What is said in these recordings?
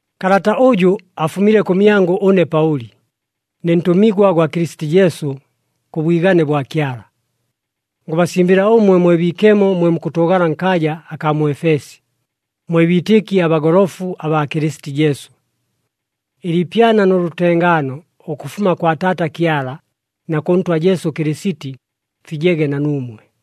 Kalata ʉjʉ afumile kʉmyangʉ ʉne Paʉli, ne ntʉmigwa gwa Kɨlɨsiti Jesu, kʉ bwigane bwa Kyala. Ngʉbasimbɨla ʉmwe mwe biikemo mwe mukʉtʉʉgala nkaaja akaa mu Efesi, mwe biitɨki abagolofu abaa Kɨlɨsiti Jesu. Ɨliipyana nʉ lʉtengaano ʉkʉfuma kwa Taata Kyala na kʉ Ntwa Jesu Kɨlɨsiti, fijege na nuumwe.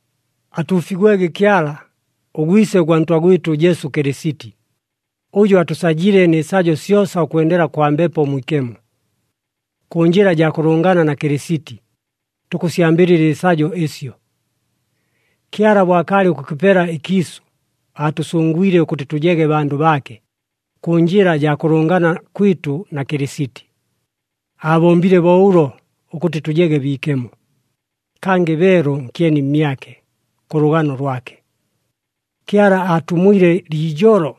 Atuufigwege Kyala, ʉGwise ʉgwa Ntwa gwɨtʉ Jesu Kɨlɨsiti, ʉjʉ atʉsajile nɨ sajo syosa ʉkwendela kwa Mbepo Mwikemo. Kʉ njɨla jaa kʉlʉngana na Kɨlɨsiti, tukʉsyambɨlɨla ɨsajo ɨsyo. Kyala bo akaalɨ ʉkʉkɨpela ɨkiisʉ, aatʉsʉngwile ʉkʉtɨ tʉjege bandʉ baake, kʉ njɨla jaa kʉlʉngana kwɨtʉ na Kɨlɨsiti. Aabombile bo ʉlo ʉkʉtɨ tʉjege biikemo, kangɨ beelu nkyeni mmyake. Kʉ lʉgano lwake, Kyala aatumwile liijolo,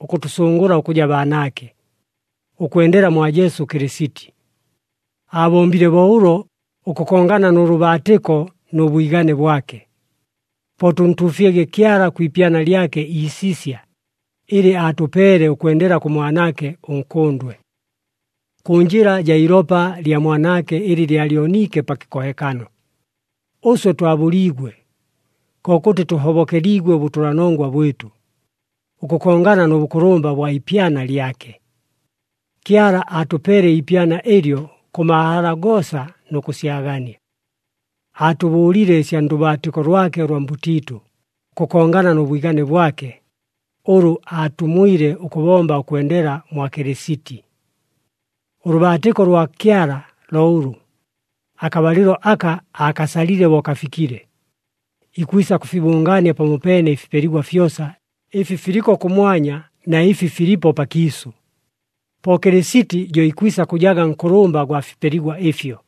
ʉkʉtʉsʉngʉla ʉkʉja baanaake, ʉkwendela mwa Jesu Kɨlɨsiti. Aabombile bo ʉlo, ʉkʉkongana nʉ lʉbaatɨko nʉ bwigane bwake. Po tʉntuufyege Kyala kwi ipyana lyake iisisya ɨlɨ aatʉpeele ʉkwendela kʉ Mwanaake ʉNkʉndwe. Kʉ njɨla jaa iilopa lya Mwanaake ɨlɨ lyalyoniike pa kɨkohekano, ʉswe twabʉliigwe, kokʉtɨ tʉhobokeliigwe ʉbʉtʉlanongwa bwɨtʉ, ʉkʉkongana nʉ bʉkʉlʉmba ʉbwa ipyana lyake. Kyala aatʉpeele iipyana ɨlyo kʉ mahala goosa nʉ kʉsyagania. Aatʉbʉʉlile ɨsya ndʉbaatɨko lwake ʉlwa mbʉtiitʉ, ʉkʉkongana nʉ bwigane bwake, ʉlʉ aatumwile ʉkʉbomba ʉkwendela mwa Kɨlɨsiti. Ʉlʉbaatɨko lwa Kyala lo ʉlʉ, akabalɨlo aka aakasalile bo kafikile, ikwisa kʉfibʉngaania pamopeene ɨfipeligwa fyosa, ɨfi filiko kʉmwanya na ɨfi filipo pakiisʉ. Po Kɨlɨsiti jo ikwisa kʉjaga nkʉlʉmba gwa fipeligwa ɨfyo.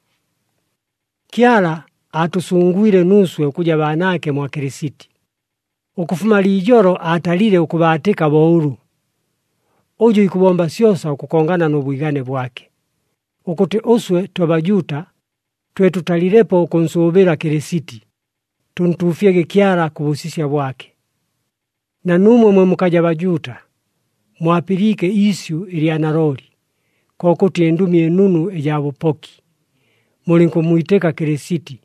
Kyala aatʉsʉngwile nuuswe ʉkʉja baanaake mwa Kɨlɨsiti. Ʉkʉfuma liijolo aatalile ʉkʉbaatɨka bo ʉlʉ, ʉjʉ ikʉbomba syosa ʉkʉkongana nʉ bwigane bwake, ʉkʉtɨ ʉswe twe Bajuuta twe tʉtalilepo ʉkʉnsʉʉbɨla Kɨlɨsiti, tʉntuufyege Kyala kʉ bʉsisya bwake. Na nuumwe mwe mukaja Bajuuta, mwapɨliike iisyʉ ɨlya nalooli, kokʉtɨ ɨNdʉmi ɨNunu ɨjaa bʉpoki, mulɨnkʉmmwitɨka Kɨlɨsiti.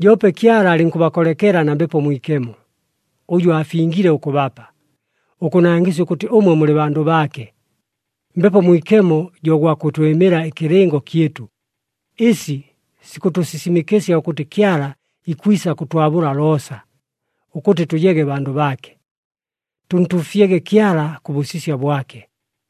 Joope Kyala alɨnkʉbakolekela na Mbepo Mwikemo, ʉjʉ aafingile ʉkʉbapa, ʉkʉnangɨsya ʉkʉtɨ ʉmwe mulɨ bandʉ baake. Mbepo Mwikemo jo gwa kʉtwɨmɨla ɨkɨlɨngo kyɨtʉ, ɨsi sikʉtʉsisimɨkɨsya ʉkʉtɨ Kyala ikwisa kʉtwabʉla loosa, ʉkʉtɨ tʉjege bandʉ baake. Tʉntuufyege Kyala kʉ bʉsisya bwake!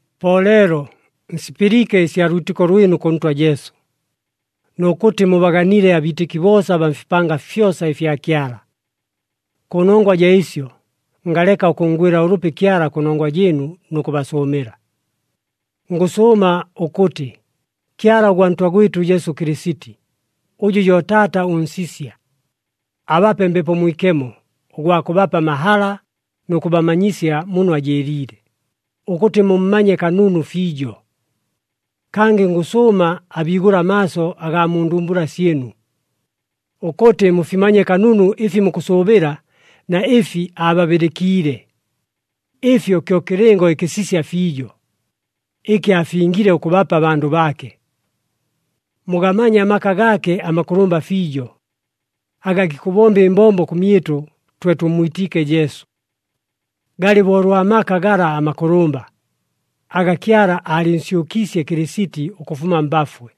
Po leelo, nsipɨliike ɨsya lwitɨko lwɨnu kʉ Ntwa Jesu, nʉ kʉtɨ mubaganile abiitɨki boosa abaa mfipanga fyosa ɨfya Kyala. Kʉnongwa jaa ɨsyo, ngaleka ʉkʉnngwɨla ʉlʉpi Kyala kʉnongwa jɨɨnu nʉ kʉbasʉʉmɨla. Ngʉsʉʉma ʉkʉtɨ, Kyala ʉgwa Ntwa gwɨtʉ Jesu Kɨlɨsiti, ʉjʉ jo Taata ʉNsisya, abape Mbepo Mwikemo, ʉgwa kʉbapa amahala nʉ kʉbamanyisya muno ajɨɨliile, ʉkʉtɨ mummanye kanunu fiijo. Kangɨ ngʉsʉʉma abiigʉle amaaso agaa mu ndumbula syɨnu, ʉkʉtɨ mufimanye kanunu ɨfi mukʉsʉʉbɨla na ɨfi aababɨlɨkiile. Ɨfyo kyo kɨlɨngo ɨkɨsisya fiijo, ɨkɨ aafingile ʉkʉbapa abandʉ baake. Mugamanye amaka gaake amakʉlʉmba fiijo, aga gikʉbomba ɨmbombo kʉmyɨtʉ twe tʉmmwitiike Jesu. Galɨ bo ʉlwa maka gala amakʉlʉmba, aga Kyala aalɨnsyʉkiisye Kɨlɨsiti ʉkʉfuma mbafwe,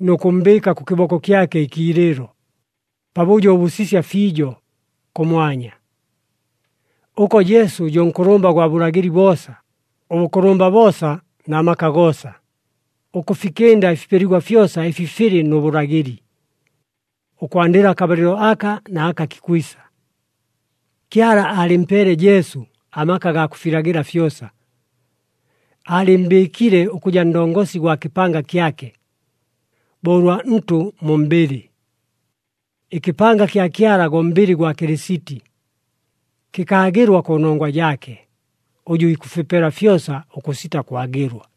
nʉ kʉmmbɨɨka kʉ kɨboko kyake ɨkiilɨɨlo, pabʉjo ʉbʉsisya fiijo, kʉmwanya. Ʉko Jesu jo nkʉlʉmba gwa bʉlagɨli boosa, ʉbʉkʉlʉmba boosa na maka goosa, ʉkʉfikɨnda ɨfipeligwa fyosa ɨfi filɨ nʉ bʉlagɨli, ʉkwandɨla akabalɨlo aka, na aka kikwisa. Kyala aalɨmpeele Jesu amaka gaa kʉfilagɨla fyosa. Aalɨmmbɨɨkile ʉkʉja Ndongosi gwa kɨpanga kyake, bo ʉlwa ntʉ mu mbɨlɨ. Ɨkɨpanga kya Kyala go mbɨlɨ gwa Kɨlɨsiti. Kɨkaagɨlwa kʉnongwa jaake, ʉjʉ ikʉfipela fyosa ʉkʉsita kwagɨlwa.